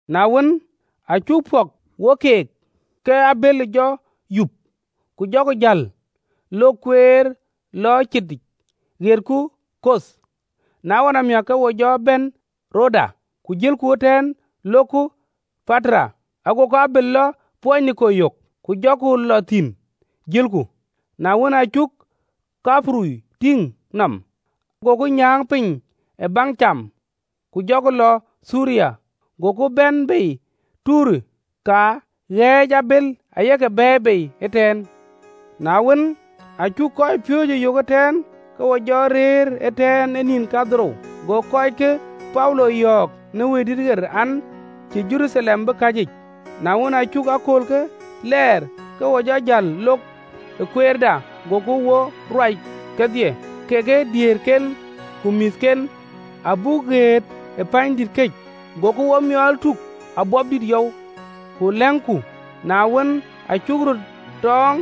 Na wën, aa cuk pɔ̈k wo keek, ke abël jɔ yup, ku jɔku jäl, lok kueer lɔ citic ɣetku Koth, na ɣɔn amiäk ke wo jɔ bɛ̈n Rodeth, ku jëlku ëtɛ̈ɛ̈n lok Patara. Agoku abël lɔ Poiniki yök, ku jɔku lɔ thïn. Na wën, aa cuk Thaiperuth tïŋ nɔm, goku nyääŋ piny ë baŋ cam, ku jɔku lɔ Thiriya, goku bɛ̈n tei ë Tayer, ka ɣɛ̈ɛ̈c abël aye ke bɛ̈ɛ̈i bei ëtɛ̈ɛ̈n. Na wën, aa cuk kɔcpiööcë yök ëtɛ̈ɛ̈n, ke wo jɔ rëër ëtɛ̈ɛ̈n ë nïn kadhorou. Go kɔckë Paulo yɔ̈ɔ̈k në Wëidït an, cïï Jeruthalem bï käcic. Na wën, aa cuk aköölkë lɛɛr, ke wo jɔ jäl lok ë kueerda, gokï wo ruac kedhie, kekë diëërken ku mïthken, abuk ɣet pänydït këc, goku womiɔl tuk ë wɛ̈ɛ̈r yɔu, ku lɛ̈ŋku. Na wën, aa cuk röt tɔ̈ɔ̈ŋ,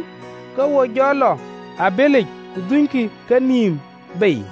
ke wo jɔ lɔ ë abëlic, ku dhunykï kenïïm bei.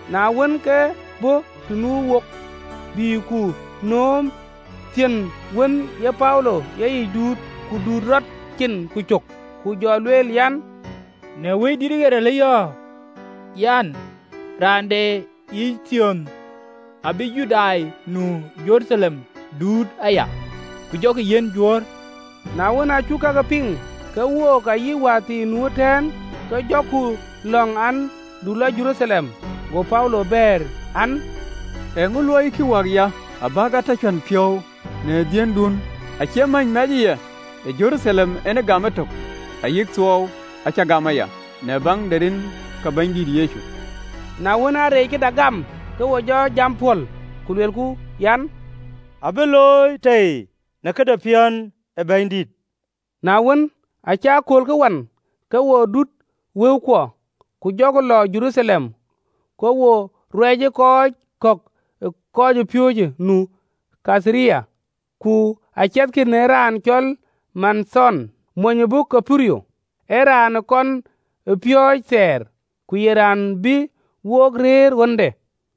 Na wën, ke bɔ̈ të nu wok, bï ku nööm thiön wën ee Paulo e yic duut, ku duut rɔt, cin ku cök, ku jɔ lueel an, “Në Wëidït ɣer alëyɔ̈ɔ̈ an: Raan de ye thiönë abïï Judai nu ë Jeruthalem duut aya, ku jɔkï yiɛ̈n Juöör.” Na wën, aa cuk kakë piŋ, ke wook ayï wäthii nu ëtɛ̈ɛ̈n ke jɔku lɔ̈ŋ an, du lɔ Jeruthalem. Go Paulo bɛ̈ɛ̈r an, “Eeŋö luɔikï wäkya, abäk a tɔ cuän piɔ̈u në dhiëndun? Acie mäny mɛcë ya ë Jeruthalem en gam etök, ayï thuɔɔu acä gam aya, në baŋ de rin ke Bɛ̈nydït Yecu.” Na wën, aa reec këda gam, ke wo jɔ jam pɔ̈l, ku luelku an, “Abï looi tei në këde piɔ̈n ë Bɛ̈nydït.” Na wën, aacï aköölkë wan, ke wo dut wëukuɔ, ku jɔku lɔ Jeruthalem. Ku wo aake ruɛcë ë kɔc kɔ̈k ë kɔcpiööcë nu ë Kaitharia, ku aciɛthkï në raan cɔl Manathon, mony ë bɔ̈ Thaiperuth, ee raan ë kɔn ë piɔ̈ɔ̈c thɛɛr, ku ye raan bï wok rëër ɣönde.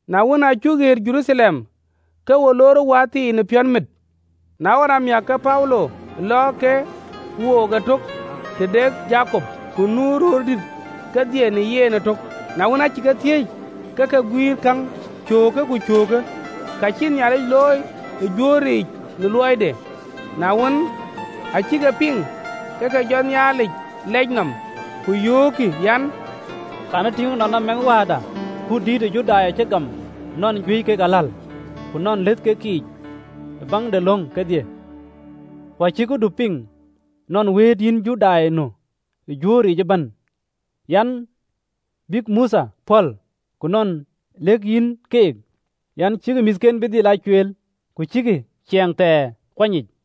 Na wën, aa cuk ɣet Jeruthalem, ke wo loor wäthii në piɔ̈nmit. Na ɣɔn amiäk, ke Paulo lɔ ke wook ëtök tëde Jakop, ku nu röördït kedhie në yen ëtök. Na wën, aacï ke thiëëc, ke ke guïïr käŋ cöökë ku cöökë, ka cïï Nhialic looi ë Juöör yiic në luɔide. Na wën, aa cïk e piŋ, ke ke jɔ Nhialic lɛc nɔm, ku yöökkï an, “Kɛ̈në tïŋ ënɔɔnë, mɛnhwääda, kut dït ë Judai cï gam, nɔn juëc kek aläl, ku nɔn lëth kek yiic ë baŋ de löŋ kedhie. Ku acïk këdu piŋ nɔn wëët yïn Judai nu ë Juöör yiic ëbɛ̈n an, bïk Mothe pɔ̈l, ku nɔn lëk yïn keek an, cïkï mïthken bï dhil aa cueel, ku cïkï ciɛɛŋ thɛɛr ee kuany yic.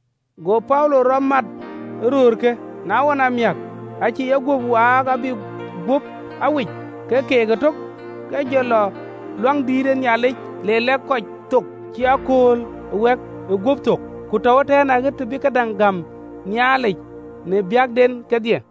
Go Paulo rɔt mat ee röörkë, na ɣɔn amiäk, acï yeguöp waak abï guöp a wic ke keek ëtök, ke jɔ lɔ Luaŋdïtic le kɔc lɛ̈k thök cï akööl ë wɛ̈k ë gup thök, ku tɔ̈u ëtɛ̈ɛ̈n, aɣet të bï këdäŋ gäm Nhialic në biäkden kedhie.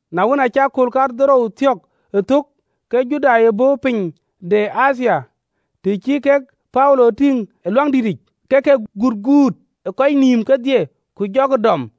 Na wën, aacï akööl kadhorou thiɔ̈k ë thök, ke Judai ë bɔ̈ piny de Athia, të cï kek Paulo tïŋ ë Luaŋdïtic, ke ke guët kut ë kɔc nïïm kedhie ku jɔkï dɔm.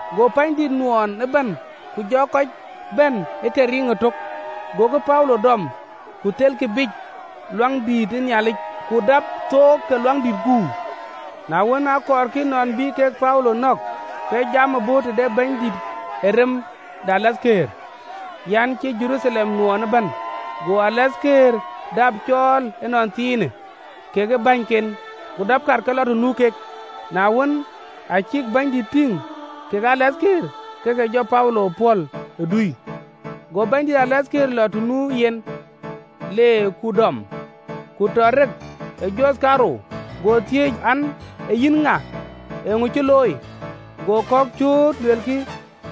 Go pänydït nuɔɔn ëbɛ̈n ku jɔ kɔc bɛ̈n ë ke riŋ ëtök, gokï Paulo dɔm, ku thelkï biic ë Luaŋdïtic. Ku dap thook ke Luaŋdït guur. Na wën, akɔɔrkï nɔn bï kek Paulo nɔ̈k, ke jam bɔ̈ tëde bɛ̈nydït ë rem de tɔŋ an, cï Jeruthalem nuɔɔn ëbɛ̈n. Go rem de tɔŋ dap cɔɔl ënɔnthiinë, kekë bänyken, ku dapkï kat ke lɔ të nu kek. Na wën, aa cïk bɛ̈nydït tïŋ kekë rem de tɔŋ, ke ke jɔ Paulo pɔ̈l ë dui. Go bɛ̈nydït de rem de tɔŋ lɔ të nu yen, le ku dɔm, ku tɔ rek ë joth kaarou, go thiëëc an, “Ee yïn ŋa? Eeŋö cï looi?” Go kɔ̈k cööt luelkï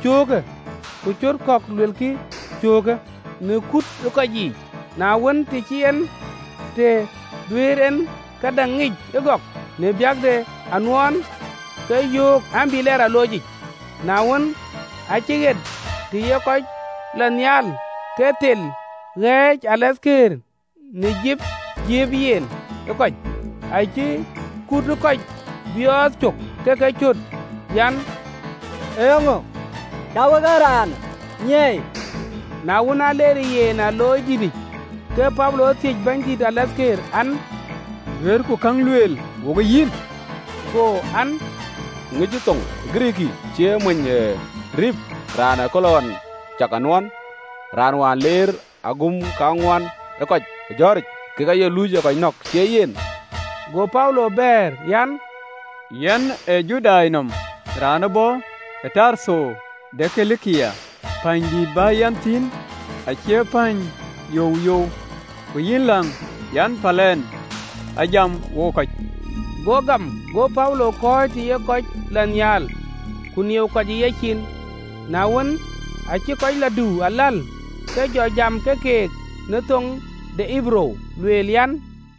cöökë, ku cöt kɔ̈k luelkï cöökë, në kut ë kɔc yiic, na wën, të cïn en të duëër en këdäŋ ŋic ë gɔk, në biäk de anuɔɔn, ke yöök an, bï lɛɛr ë aloocic. Na wën, aacï ɣet të ye kɔc lɔ nhial, ke dhilë ɣääc në rem de tɔŋ në jiëëp jiëëp ë yen në kɔc. Acïï kut ë kɔc biɔɔth cök, ke ke cöt an, “Eeŋö cä wek ee raanë nyiɛɛi?” Na wën an, leerë yen ë aloocdïtic, ke Paulo thiëc bɛ̈nydït de rem ë tɔŋ an, “Duëërku käŋ lueel wokë yïn?” Go an, “Ŋic thöŋ ë Girikii? Cïï ye mony ë Ripë, raan ë kööl ɣɔn cak anuɔɔn, raan wään leer agum kaŋuan ë kɔc ë jɔ̈ɔ̈ric, kek aye luuc ë kɔc nɔ̈k, cïï ye yen?” Go Paulo bɛ̈ɛ̈r an, “Yɛn ee Judai nɔm, raan ë bɔ̈ Tartho de Kilikia, pänydït bä yɛn thïn acie päny youyou. Ku yïn läŋ, an, päl ɛn a jam wo kɔc.” Go gam, go Paulo kɔ̈ɔ̈c të ye kɔc lɔ nhial, ku nieu kɔc ë yecin. Na wën, aacï kɔc lɔ dïu aläl, ke jɔ jam ke keek në thoŋ de Ɣeberuu, lueel an: